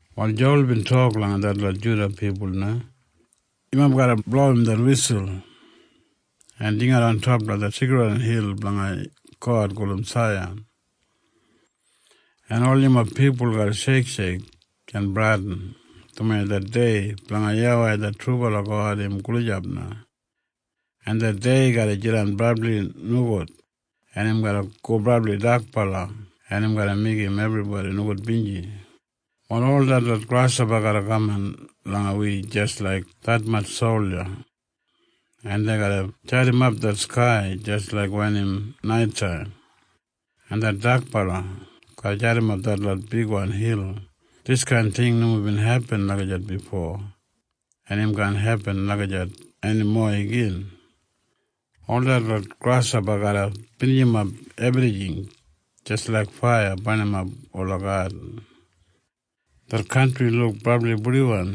Wal Jowal bin tok langa detlot Juda pipul na, “Yumob garra blowim det wisul en jingat ontop langa det seikridwan hil blanga God gulum Saiyan. En ol yumob pipul garra sheiksheik en bradin, dumaji det dei blanga YAWEI det trubala God im gulijap na, en det dei garra jidan brabli nogud, en im garra go brabli dakbala, en im garra meigim ebribodi nogudbinji. “Wal ol detlot grashopa garra kaman langa wi jis laik detmatj solja, en dei garra jadimap det skai jis laik wen im naitaim, en det dakbala garra jadimap detlot bigwan hil. Diskain ting nomo bin hepin lagijat bifo, en im kaan hepin lagijat enimo igin. “Ol detlot grashopa garra binijimap ebrijing jis laiga faiya barnimap ola gadin. Det kantri luk brabli purdiwan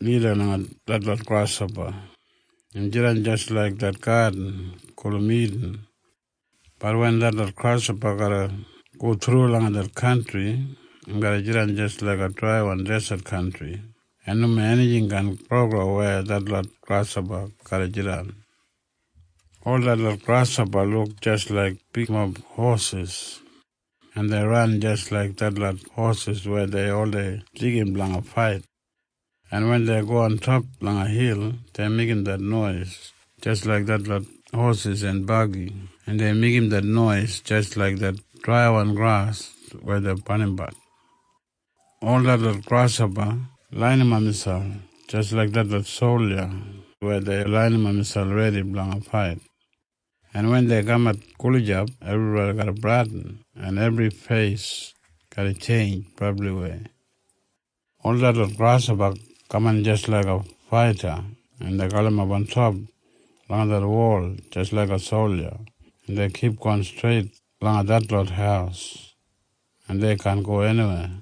lida langa detlot grashopa. Im jidan jis laik det gadin gulum Idin. Bat wen detlot grashopa garra go thru langa det kantri, im garra jidan jis laiga draiwan deset kantri. En nomo enijing kaan gro weya detlot grashopa garra jidan. “Ol detlot grashopa luk jis laik bigmob hosis, en dei ran jis laik detlot hosis weya dei oldei deigim blanga fait. En wen dei go ontop langa hil, dei meigim det nois jis laik detlot hosis en bagi, en dei meigim det nois jis laik det draiwan gras weya dei barnimbat. “Ol detlot grashopa lainimap miselp jis laik detlot solja weya dei lainimap miselp redi blanga fait. En wen dei kamat gulijap, ebribodi garra bradin, en ebri feis garra tjeinj brabliwei. “Ol detlot grashopa kaman jis laiga faita, en dei galimap ontop langa det wol jis laiga solja, en dei kipgon streit langa detlot haus, en dei kaan go eniwei.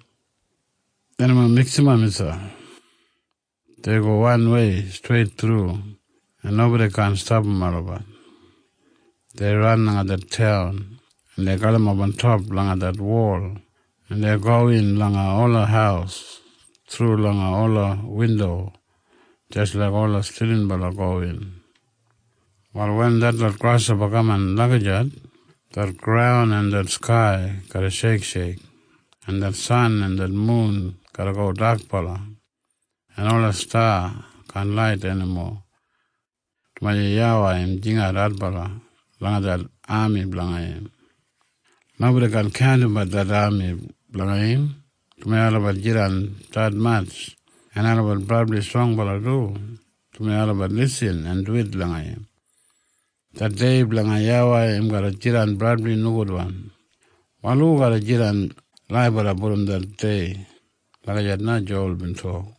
Dei nomo miksimap miselp. Dei go wanwei streit thru, en nobodi kaan stapam olabat. Dei ran langa det taun, en dei galimap ontop langa det wol, en dei gowin langa ola haus thru langa ola windo jis laik ola stilinbala gowin. “Wal wen detlot grashopa kaman lagijat, det graun en det skai garra sheiksheik, en det san en det mun garra go dakbala, en ola sta kaan lait enimo, dumaji YAWEI im jingat adbala langa det ami blanga im. Nobodi kaan kaundimbat det ami blanga im, dumaji olabat jidan detmatj. En olabat brabli strongbala du, dumaji olabat lisin en duwit langa im. “Det dei blanga YAWEI im garra jidan brabli nogudwan. Wal hu garra jidan laibala brom det dei?” Lagijat na Jowal bin tok.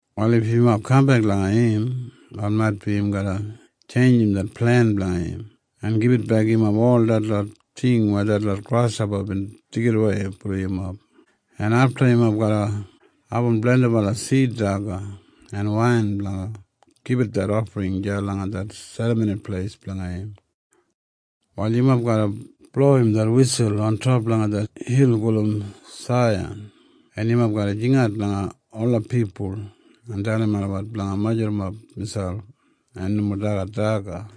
“Wal if yumob kambek langa im, wal maitbi im garra tjeinjim det plen blanga im en gibitbek yumob ol detlot ting weya detlot grashopa bin deigidawei brom yumob. En afta yumob garra abum blendibala sid daga en wain blanga gibit det ofring deya langa det Serramoni Pleis blanga im. “Wal yumob garra blowim det wisul ontop langa det hil gulum Saiyan. En yumob garra jingat langa ola pipul en dalim olabat blanga majurrumap miselp en nomo dagat daga.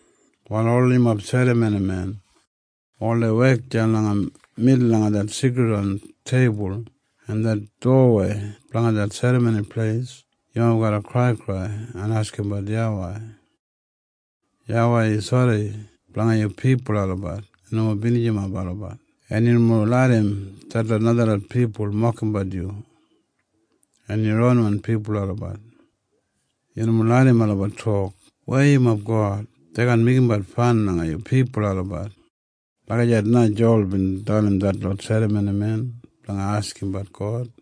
“Wal ol yumob serramonimen hu oldei wek deya langa midul langa det seikridwan teibul en det dowawei blanga det Serramoni Pleis, yumob garra kraikrai en askimbat YAWEI, ‘YAWEI, yu sori blanga yu pipul olabat en nomo binijimap olabat. En yu nomo larram detlot najalot pipul mokimbat yu en yu ronwan pipul olabat. Yu nomo larram olabat tok, “Weya yumob God?” Dei kaan meigimbat fan langa yu pipul olabat.’” Lagijat na Jowal bin dalim detlot serramonimen blanga askimbat God.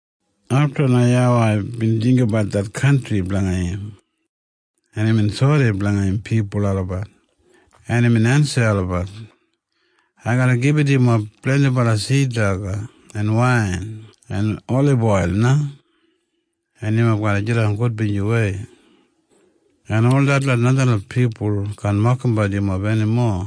Afta na YAWEI bin jinggabat det kantri blanga im. En imbin sori blanga im pipul olabat. En imbin ensim olabat, “Ai garra gibit yumob blendibala sid daga en wain en oliboil na, en yumob garra jidan gudbinjiwei. En ol detlot najalot pipul kaan mokimbat yumob enimo.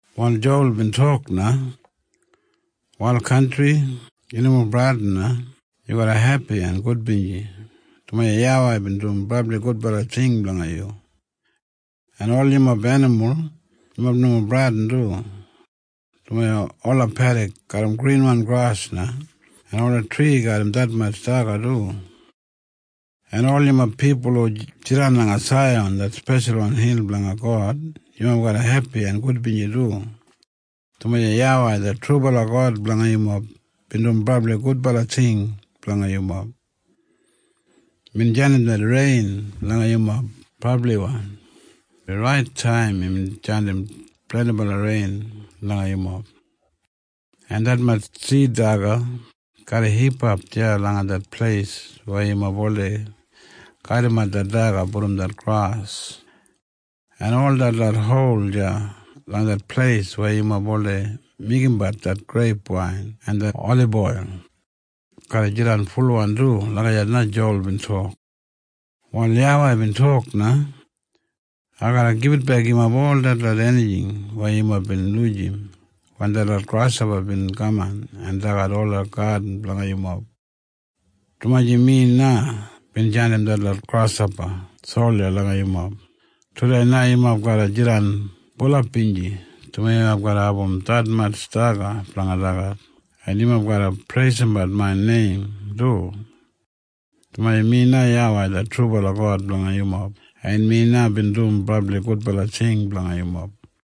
Wal Jowal bin tok na, “Wal kantri, yu nomo bradin na. Yu garra hepi en gudbinji, dumaji YAWEI bin dum brabli gudbala ting blanga yu. “En ol yumob enimul, yumob nomo bradin du, dumaji ola pedik garram grinwan gras na. En ola tri garram detmatj daga du. “En ol yumob pipul hu jidan langa Saiyan det speshalwan hil blanga God, yumob garra hepi en gudbinji du, dumaji YAWEI det trubala God blanga yumob bin dum brabli gudbala ting blanga yumob. Imbin jandim det rein langa yumob brabliwan. Rait taim imbin jandim blendibala rein langa yumob. En detmatj sid daga garra hipap deya langa det pleis weya yumob oldei kadimat det daga brom det gras. En ol detlot hol deya langa det pleis weya yumob oldei meigimbat det greip wain en det oliboil garra jidan fulwan du.” Lagijat na Jowal bin tok. Wal YAWEI bin tok na, “Ai garra gibitbek yumob ol detlot enijing weya yumob bin lujim wen detlot grashopa bin kaman en dagat ola gadin blanga yumob, dumaji mi na bin jandim detlot grashopa solja langa yumob. Tudei na yumob garra jidan bulap binji, dumaji yumob garra abum detmatj daga blanga dagat. En yumob garra preisimbat main neim du, dumaji mi na YAWEI det trubala God blanga yumob, en mi na bin dum brabli gudbala ting blanga yumob.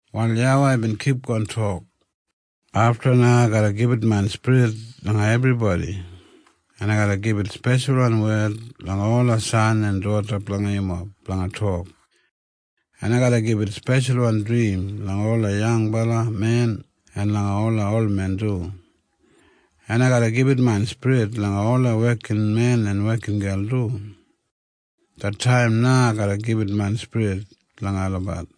Wal YAWEI bin kipgon tok, “Afta na ai garra gibit main spirit langa ebribodi. En ai garra gibit speshalwan wed langa ola san en doda blanga yumob blanga tok. En ai garra gibit speshalwan drim langa ola yangbala men en langa ola olmen du. En ai garra gibit main spirit langa ola wekinmen en wekingel du. Det taim na ai garra gibit main spirit langa olabat,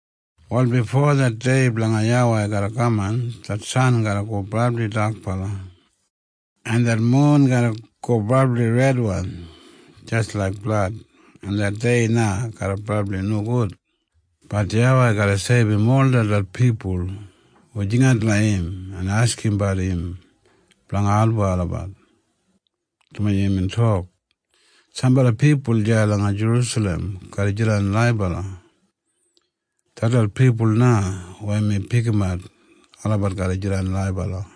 Wal bifo det dei blanga YAWEI garra kaman, det san garra go brabli dakbala, en det mun garra go brabli redwan jis laik blad, en det dei na garra brabli nogud. Bat YAWEI garra seibum ol detlot pipul hu jingat langa im en askimbat im blanga album olabat, dumaji imbin tok, “Sambala pipul deya langa Jerusalem garra jidan laibala. Detlot pipul na weya mi pikimat olabat garra jidan laibala.”